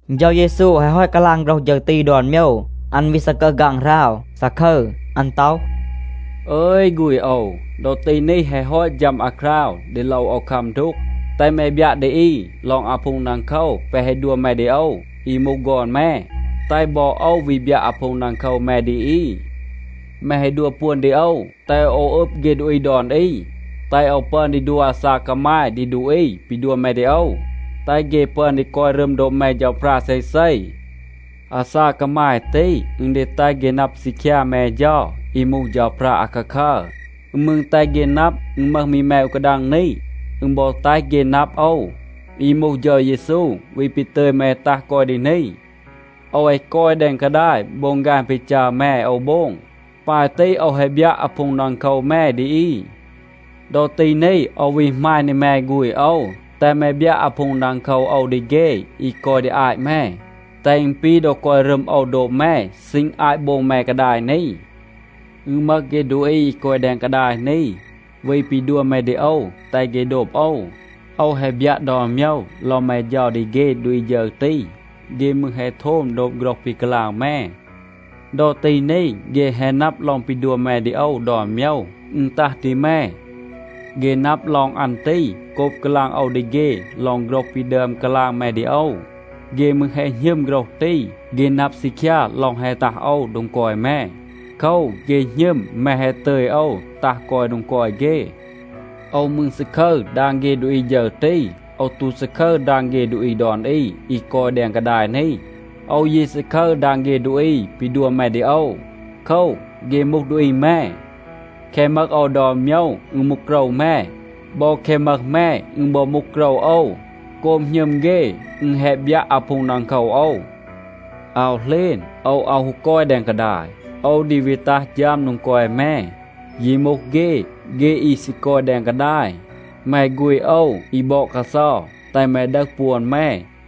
เฌา เยซู แฮะ ฮอต กาลาง โฆรห ฌึร ตี ดอน โมยว, อัน วี ซากึห ฆางหราว, ซาคึร. อัน ต็อห, “อึย ฆูณ โอว, ดอ ตี นี แฮะ ฮอต ฌัม อาคราว ดี โลว โอว คัม ดูก. แตห แม บยัะ ดี อี ลอง อาพูง ดังโคว แปะ แฮะ ดัว แม ดี โอว อี มูห ฆอน แม, แตห บอ โอว วี บยัะ อาพูง ดังโคว แม ดี อี. แม แฮะ ดัว ปวน ดี โอว, แตห โอว อึบ เฆ ดูอี ดอน อี, แตห โอว ปึอน ดี ดัว อาซาก กามาย ดี ดูอี ปี ดัว แม ดี โอว, แตห เฆ ปึอน ดี กอย รึม โดบ แม เฌาพรา เซเซ. อาซาก กามาย ตี, อึณ ดี แตห เฆ นับ ซีคยา แม เฌา, อี มูห เฌาพรา อาคาคัร. อึณ มืร แตห เฆ นับ, อึณ มึห มี แม อู กาดัง นี. อึณ บอ แตห เฆ นับ โอว, อี มูห เฌา เยซู, วี ปี ตึย แม ตัห กอย ดี นี. โอว แฮะ กอย แดง กาดาย, โบง ฆาน ปี จัร แม โอว โบง. ปาย ตี โอว แฮะ บยัะ อาพูง ดังโคว แม ดี อี. ดอ ตี นี, โอว วี หมาณ ดี แม ฆูณ โอว, แตห แม บยัะ อาพูง ดังโคว โอว ดี เฆ อี กอย ดี อาต แม, แตห อึณ ปี ดอ กอย รึม โอว โดบ แม ซีณ อาต โบง แม กาดาย นี. อึณ มึห เฆ ดูอี อี กอย แดง กาดาย นี, วี ปี ดัว แม ดี โอว, แตห เฆ โดบ โอว. โอว แฮะ บยัะ ดอน โมยว ลอง แม เฌา ดี เฆ ดูอี ฌึร ตี. เฆ มืร แฮะ โทม โดบ โฆรห ปี กาลาง แม. ดอ ตี นี, เฆ แฮะ นับ ลอง ปี ดัว แม ดี โอว ดอน โมยว, อึณ ตัห ดี แม. เฆ นับ ลอง อัน ตี โกบ กาลาง โอว ดี เฆ ลอง โฆรห ปี ดึอม กาลาง แม ดี โอว. เฆ มืร แฮะ หณึม โฆรห ตี, เฆ นับ ซีคยา ลอง แฮะ ตัห โอว โดง กอย แม. โคว, เฆ หณึม แม แฮะ ตึย โอว ตัห กอย โดง กอย เฆ. โอว มืร ซาคึร ดาง เฆ ดูอี ฌึร ตี. โอว ตู ซาคึร ดาง เฆ ดูอี ดอน อี อี กอย แดง กาดาย นี. โอว ยี ซาคึร ดาง เฆ ดูอี ปี ดัว แม ดี โอว. โคว, เฆ มูห ดูอี แม. แคะ มึห โอว ดอน โมยว, อึณ มูห โกรว แม. บอ แคะ มึห แม, อึณ บอ มูห โกรว โอว. โกบ หณึม เฆ, อึณ แฮะ บยัะ อาพูง ดังโคว โอว. อาว เหลณ, โอว อาว ฮู กอย แดง กาดาย. โอว ดี วี ตัห ฌัม โดง กอย แม. ยี มูห เฆ, เฆ อี ซี กอย แดง กาดาย. แม ฆูณ โอว, อี บอด กาเซา, แตห แม ดึห ปวน แม,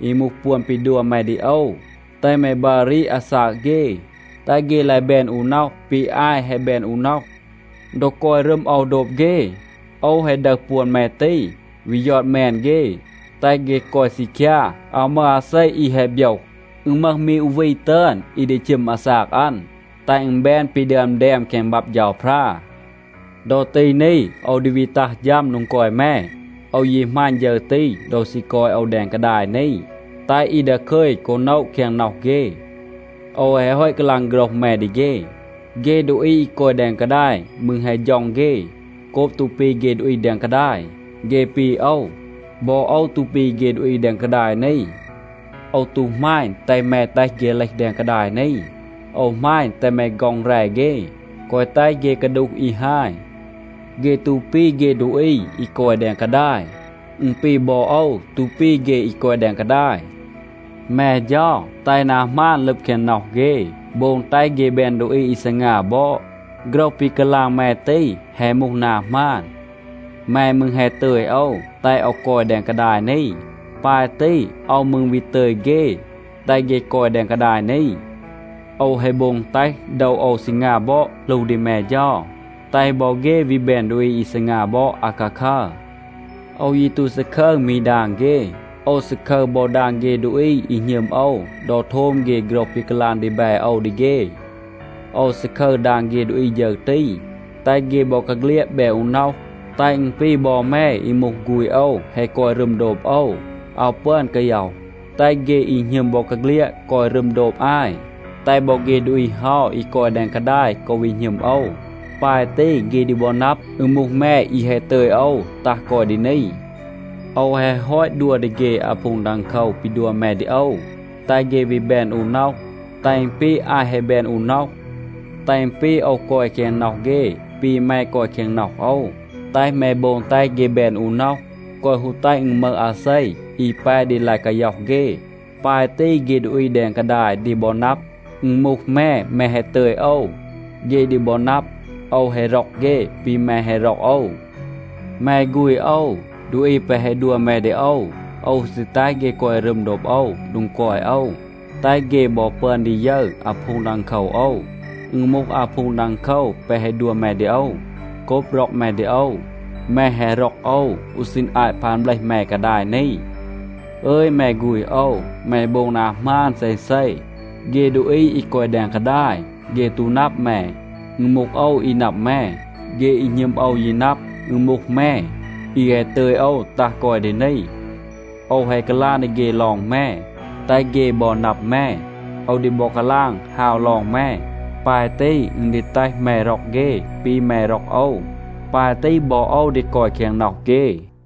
อี มูห ปวน ปี ดัว แม ดี โอว, แตห แม บัร รีด อาซาก เฆ, แตห เฆ ลาย แบน อู น็อห ปี อาย แฮะ แบน อู น็อห. ดอ กอย รึม โอว โดบ เฆ, โอว แฮะ ดึห ปวน แม ตี, วี ยอด แมน เฆ, แตห เฆ กอย ซีคยา. อาว มึห อาเซ อี แฮะ โบยห. อึณ มึห มี อู วี ตึอน, อี ดี ชึม อาซาก อัน, แตห อึณ แบน ปี ดึอม แดม แคง บับ เฌาพรา. ดอ ตี นี, โอว ดี วี ตัห ฌัม โดง กอย แม. โอว ยี หมาณ ฌึร ตี ดอ ซี กอย โอว แดง กาดาย นี, แตห อี ดาคึย กอ โนะ แคง น็อห เฆ. โอว แฮะ ฮอต กาลาง โฆรห แม ดี เฆ. เฆ ดูอี อี กอย แดง กาดาย มืร แฮะ ฌ็อง เฆ โกบ ตู ปี เฆ ดูอี แดง กาดาย. เฆ ปี โอว. บอ โอว ตู ปี เฆ ดูอี แดง กาดาย นี. โอว ตู หมาณ, แตห แม แตห เฆ เลห แดง กาดาย นี. โอว หมาณ, แตห แม ฆ็อง แร เฆ, แกวะ แตห เฆ กาดูห อี ฮาย. เฆ ตู ปี เฆ ดูอี อี กอย แดง กาดาย. อึณ ปี บอ โอว ตู ปี เฆ อี กอย แดง กาดาย. แม เฌา, แตห นา หมาน ลึบ แคง น็อห เฆ, โบง แตห เฆ แบน ดูอี อี ซีงา บอด. โฆรห ปี กาลาง แม ตี แฮะ มูห นา หมาน. แม มืร แฮะ ตึย โอว, แตห โอว กอย แดง กาดาย นี. ปาย ตี โอว มืร วี ตึย เฆ, แตห เฆ กอย แดง กาดาย นี. โอว แฮะ โบง แตห โดว โอว ซีงา บอด หลู ดี แม เฌา, แตห บอ เฆ วี แบน ดูอี อี ซีงา บอด อาคาคัร. โอว ยี ตู ซาคึร มี ดาง เฆ. โอว ซาคึร บอ ดาง เฆ ดูอี อี หณึม โอว ดอ โทม เฆ โฆรห ปี กาลาง ดีแบ โอว ดี เฆ. โอว ซาคึร ดาง เฆ ดูอี ฌึร ตี, แตห เฆ บอกาเฆลียด แบน อู น็อห, แตห อึณ ปี บอ แม อี มูห ฆูณ โอว แฮะ กอย รึม โดบ โอว, อาว ปึอน กาย็อห. แตห เฆ อี หณึม บอกาเฆลียด กอย รึม โดบ อาย, แตห บอ เฆ ดูอี เฮา อี กอย แดง กาดาย กอ วี หณึม โอว. ปาย ตี เฆ ดี บอ นับ, อึณ มูห แม อี แฮะ ตึย โอว ตัห กอย ดี นี. โอว แฮะ ฮอต ดัว ดี เฆ อาพูง ดังโคว ปี ดัว แม ดี โอว, แตห เฆ วี แบน อู น็อห, แตห อึณ ปี อาย แฮะ แบน อู น็อห. แตห อึณ ปี โอว กอย แคง น็อห เฆ ปี แม กอย แคง น็อห โอว. แตห แม โบง แตห เฆ แบน อู น็อห, แกวะ ฮู แตห อึณ มึห อาเซ อี แป ดี ลาย กาย็อห เฆ. ปาย ตี เฆ ดูอี แดง กาดาย ดี บอ นับ, อึณ มูห แม, แม แฮะ ตึย โอว. เฆ ดี บอ นับ, โอว แฮะ ร็อก เฆ ปี แม แฮะ ร็อก โอว. แม ฆูณ โอว, ดูอี แปะ แฮะ ดัว แม ดี โอว, โอว ซี แตห เฆ กอย รึม โดบ โอว โดง กอย โอว, แตห เฆ บอ ปึอน ดี ยึร อาพูง ดังโคว โอว. อึณ มูห อาพูง ดังโคว แปะ แฮะ ดัว แม ดี โอว โกบ ร็อก แม ดี โอว. แม แฮะ ร็อก โอว อู ซีณ อาต พาน เบลห แม กาดาย นี. อึย แม ฆูณ โอว, แม โบง นา หมาน เซเซ. เฆ ดูอี อี กอย แดง กาดาย, เฆ ตู นับ แม. อึณ มูห โอว อี นับ แม. เฆ อี หณึม โอว ยี นับ, อึณ มูห แม, อี แฮะ ตึย โอว ตัห กอย ดี นี. โอว แฮะ กาลาง ดี เฆ ลอง แม, แตห เฆ บอ นับ แม. โอว ดี บอ กาลาง ฮาว ลอง แม. ปาย ตี อึณ ดี แตห แม ร็อก เฆ ปี แม ร็อก โอว. ปาย ตี บอ โอว ดี กอย แคง น็อห เฆ.”